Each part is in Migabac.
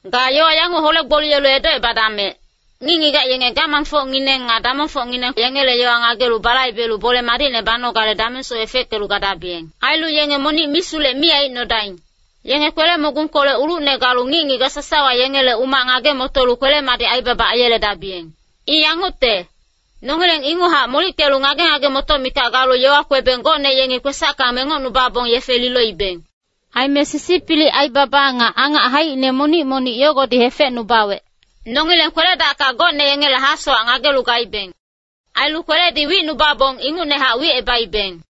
Ga yowa yanguc hole-gboliyelu edocebadamec, ngic-ngigac yenge gamangfocngineng nga damongfocngineng yengele yowa ngagelu balaibelu bole madicne banogale damengsoc efeckelu gadabiyeng. Ailu yenge monic misulec mi aicnodaing. Yenge kwele-mogungkolec ulucne galu ngic-ngigac sasawa yengele umac ngage-motolu kwele-madic aibaba aiyeledabiyeng. I yangucte, nongileng inguchac molickelu ngage-ngage-motoc mikac galu yowa kwebeng gocne yengi kwesacka mengocnubabong yefe liloibeng. Aime sisipilic aibaba nga angac haicine monic-monic yogodi hefecnubawec. Nongileng kwele-dacka gocne yengele hasowac ngagelu gaibeng. Ailu kweledi wicnubabong ingucnehac wicebaibeng.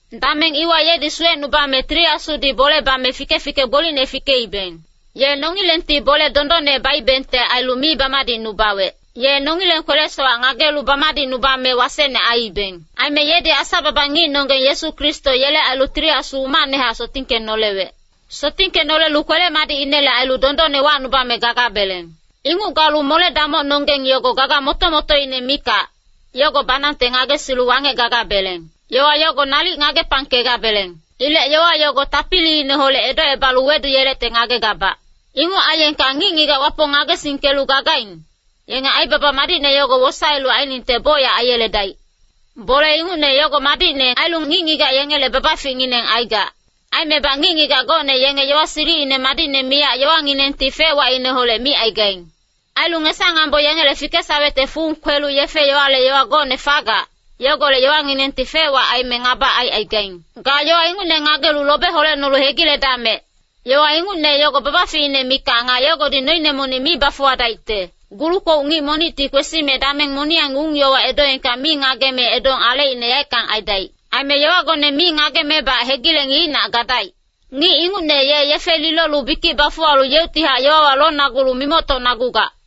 Dameng iwa yedi suwecnubame Tili Asudi bole bame fike-fike gbolicne fikeibeng. Ye nongilengti bole dondonne baibengte ailu mi bamadicnubawec. Ye nongileng kwele-sowac ngagelu bamadicnubame wasecne aiibeng. Aime yedi Asa-baba ngicnonggeng Yesu Kristo yele ailu Tili Asu umacnehac sotingkenolewec. Sotingkenolelu kwele-madicinele ailu dondonne wacnubame gagabeleng. Inguc galu mole-damocnonggeng yogo gaga moto-motoine mikac, yogo banangte ngagesilu wangec gagabeleng. Yowa yogo nalic ngagepangkegabeleng. Ilec yowa yogo tapiliineholec edocebalu weduyelecte ngagegabac. Inguc aiyengka ngic-ngigac Wapong ngagesingkelu gagaing, yenge aibaba madicne yogo wosaelu ainingte bocyac aiyeledaic. Bole ingucne yogo madicne ailu ngic-ngigac yengele babaficngineng aigac. Aimebac ngic-ngigac gocne yenge yowa silicine madicne miyac yowanginengti fec-wacineholec micaigaing. Ailu ngesa-ngambo yengele fikesawecte fung kwelu yefe-yowale yowa gocne fagac, yogolec yowanginengti fec-wac aime ngaba aicaigaing. Ga yowa ingucne ngagelu lobe holecnolu hegiledamec. Yowa ingucne yogo babaficine mikac nga yogodi noine monic mi bafuwadaicte. Gulu-kwouc ngic monicti kwesime dameng moniyang ung-yowa edoengka mi ngageme, edong alecine yaeckang aidaic. Aime yowagone mi ngagemebac hegileng yeicnac gadaic. Ngic ingucne ye yefe lilolu bikic bafuwalu yeuctihac yowawa lonagulu mimoctocnagugac.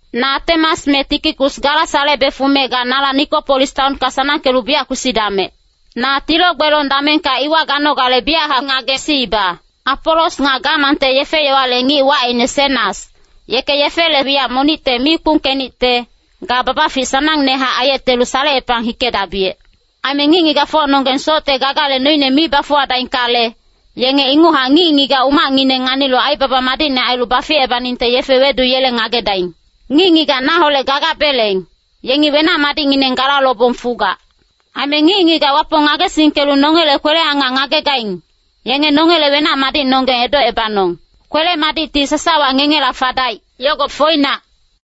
Na Atemas me Tikikus gala salebe fume ga nala Nikopolis taonka sanangkelu biyac kwesidamec. Na tilo-gbelong damengka iwa ganogale biyachac ngagesiiba. Apolos nga gamangte yefe-yowale ngic wacine Senas, yeke yefele wiyac monicte mi kpungkenicte, ga babafic sanangnehac aiyetelu salecepang hikedabiyec. Aime ngic-ngigacfocnonggeng socte gagale noine mi bafuwadaingkale, yenge inguchac ngic-ngigac umacngineng nganilu aibaba madicne ailu baficebaningte yefe weduyeleng ngagedaing. Ngic-ngigac naholec gagabeleng, yengi wenac-madicngineng gala lobong fugac. Aime ngic-ngigac Wapong ngagesingkelu nongele kwele-angac ngagegaing, yenge nongele wenac-madicnonggeng edocebanong. Kwele-madicti sasawa ngengela fadaic. Yogo foinac.